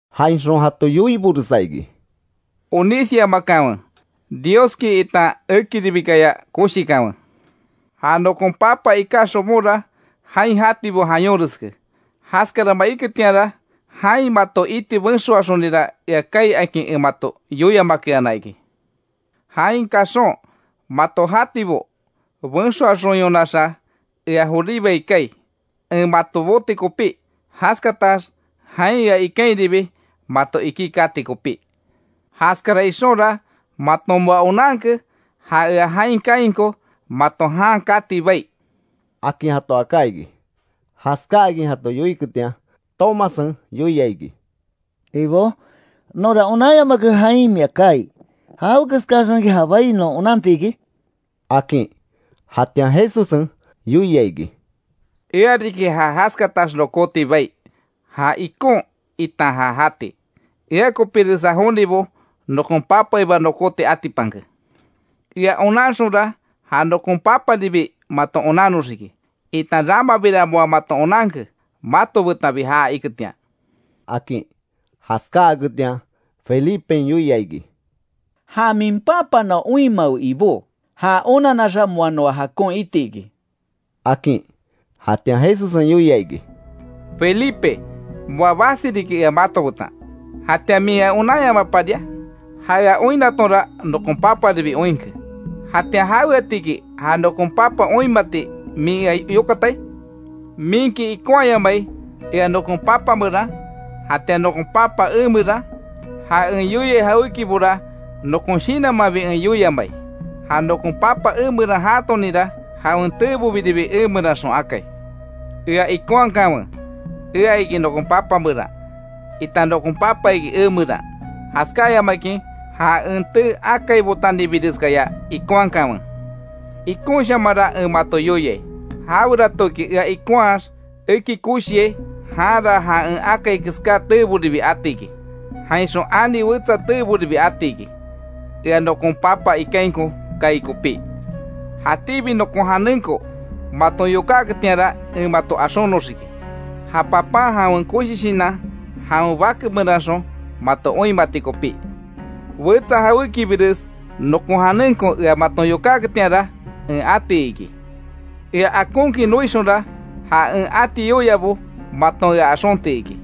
Jainxon jato yoiboresa iki: “Onísyamakanwe, Dioski itan ekiribikaya koshikanwe. Ja nokon Papa iká xobonra jain jatibo jayonreske, jaskarama iketianra jain mato iti benxoaxonira ea kaai akin en mato yoiamakeana iki. Jain kaxon, mato jatibo benxoaxonyonaxa, ea joribai kaai, en mato boti kopí, jaskatax jain ea ikainribi mato ikí kati kopí. Jaskara ixonra, maton moa onanke ja ea jain kaainko mato jan kati bai”, akin jato aká iki. Jaskáakin jato yoiketian, Tomassen yoia iki: —¿Ibó, nonra onanyamake jain mia kaai? ¿Jawekeskaxonki ja bai non onantiki? —akin. Jatian Jesussen yoia iki: —Ea riki ja jaskatax nokóti bai, ja ikon, itan ja jati. Ea kopíresa jonibo nokon Papaiba nokóti atipanke. Ea onanxonra, ja nokon Paparibi maton onannoxiki, itan ramabira moa maton onanke, mato betanbi jaa iketian —akin. Jaskáaketian Felipen yoia iki: —Ja min Papa noa oinmawe Ibó, já onanaxa moa noa jakon itiki —akin. Jatian Jesussen yoia iki: —Felipe, moa basi riki ea mato betan ¿Jatian min ea onanyamaparia? Ja ea oinnatonra nokon Paparibi oinke; ¿Jatian jaweatiki ja nokon papa oinmati min ea yokatai? ¿Minki ikonhayamai ea nokon Papa meran, jatian nokon Papa emeran? Ja en yoiai jawékibora nokon shinanmanbi en yoiamai. Ja nokon Papa emeran jaatoninra, jawen teebobiribi emeranxon akai. Ea ikonhakanwe ea iki nokon Papa meran, itan nokon papa iki emeran, jaskáyamakin ja en tee akaibotanibireskaya ikonhakanwe. Ikonshamanra en mato yoiai, jaweratoki ea ikonhaax eki koshiai, janra ja en akai keská teeboribi atiki, jainxon, ani wetsa teeboribi ati iki, Ea nokon Papa ikainko kaai kopí. Jatíbi nokon janenko maton yokáketianra, en mato axonoxiki, ja Papan jawen koshi shinan jawen Bake meranxon mato oinmati kopí. Wetsa jawékibires nokon janenko ea maton yokáketianra, en ati iki. Ea akonkin noixonra, ja en ati yoiabo maton ea axonti iki.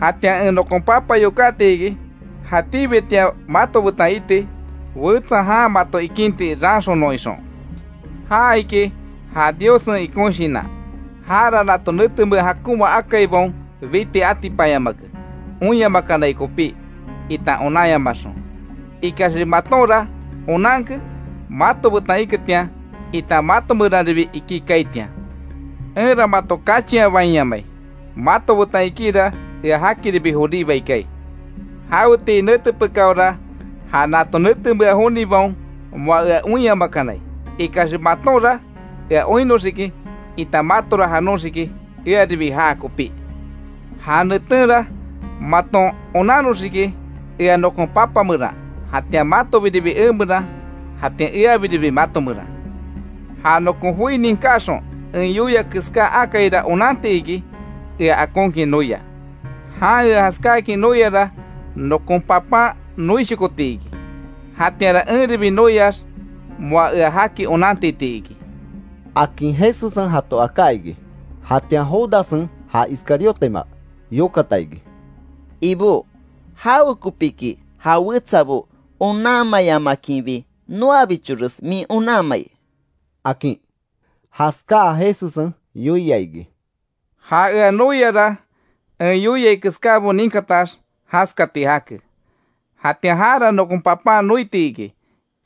Jatianra en nokon Papa yokáti iki, jatíbitian mato betan iti, wetsa jan mato ikinti raanxonon ixon. Ja iki ja Diossen ikon Shinan, jara nato netemea jakonma akaibaon biti atipanyamake, oinyamakanai kopí itan onanyamaxon; Ikaxbi matonra onanke mato betan iketian, itan mato meranribi ikí kaaitian. Enra mato kachianbainyamai, mato betan ikíra ea jakiribi joribai kaai. Jawetii nete pekáora, ja nato netemea jonibaon moa ea oinyamakanai. Ikaxbi matonra ea oinnoxiki itan matora janoxiki earibi jaa kopí. Ja netenra maton onannoxiki ea nokon Papa meran, jatian matobiribi emeran, jatian eabiribi mato meran. Ja nokon joi ninkaxon en yoia keská akaira, onanti iki ea akonkin noia. Jan ea jaskáakin noiara nokon Papan noishokoti iki, jatianra enribi noiax moa ea jaki onantiti iki —akin Jesussen jato aká iki. Jatian Judassen (ja Iscariotema) yokata iki: —Ibó ¿Jawekopíki ja wetsabo onanmayamakinbi noabichores min onanmai? —akin. Jaskáa Jesussen yoia iki: —Ja ea noiara en yoiai keskábo ninkatax jaskati jake. Jatian jara nokon Papan noiti iki,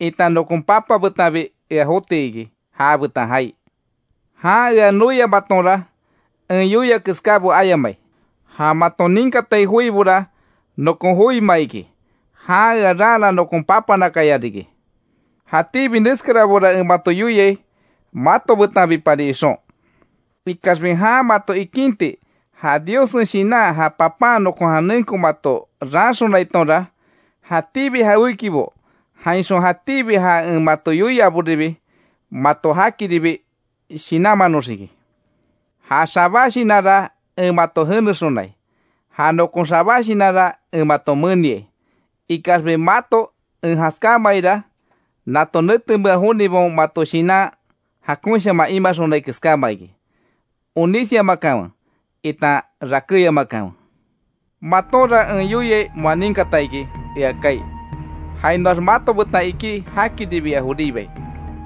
itan nokon Papa betanbi ea joti iki, jabetan jaai. Jan ea noiamaatonra, en yoia keskábo ayamai. Ja maton ninkatai joibora nokon joima iki, jan ea raana nokon Papanakaya riki. Jatíbi neskarabora en mato yoiai, mato betanbipari ixon. Ikaxbi jan mato ikinti ja Diossen Shinan, ja Papan nokon janenko mato raanxonaitonra jatíbi jawékibo jainxon jatíbi ja en mato yoiaboribi, mato jakiribi shinanmanoxiki. Ja xabá shinanra en mato jenexonai, ja nokon xabá shinanra en mato meniai, ikaxbi mato en jaskámaaira nato netemea jonibaon mato shinan jakonshaman imaxonai keskáma iki, onisyamakanwe itan rakéyamakanwe. Matonra en yoiai moa ninkata iki ea kaai, jainoax mato betan ikí jakiribi ea joribai.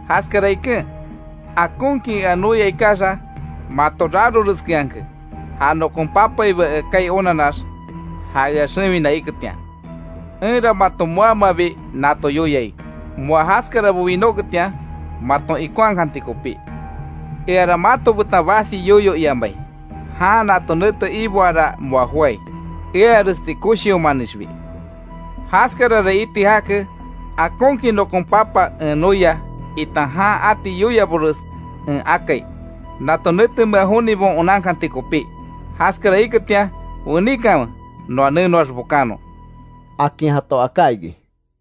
Jaskara iken, akonkin ea noia ikaxa, mato raroreskeanke ja nokon Papaiba ea kaai onanax, ja ea xewina iketian. Enra mato moamabi nato yoiai, moa jaskarabo winóketian maton ikonhakanti kopí. Eara mato betan basi yoyo iamai, jan nato nete iboara moa joái, earesti koshiomanixbi. Jaskarara iti jake, akonkin nokon Papa en noia, itan jan ati yoiabores en akai, nato netemea jonibaon onankanti kopí, jaskara iketian weníkanwe noa nenoax bokannon —akin jato aká iki.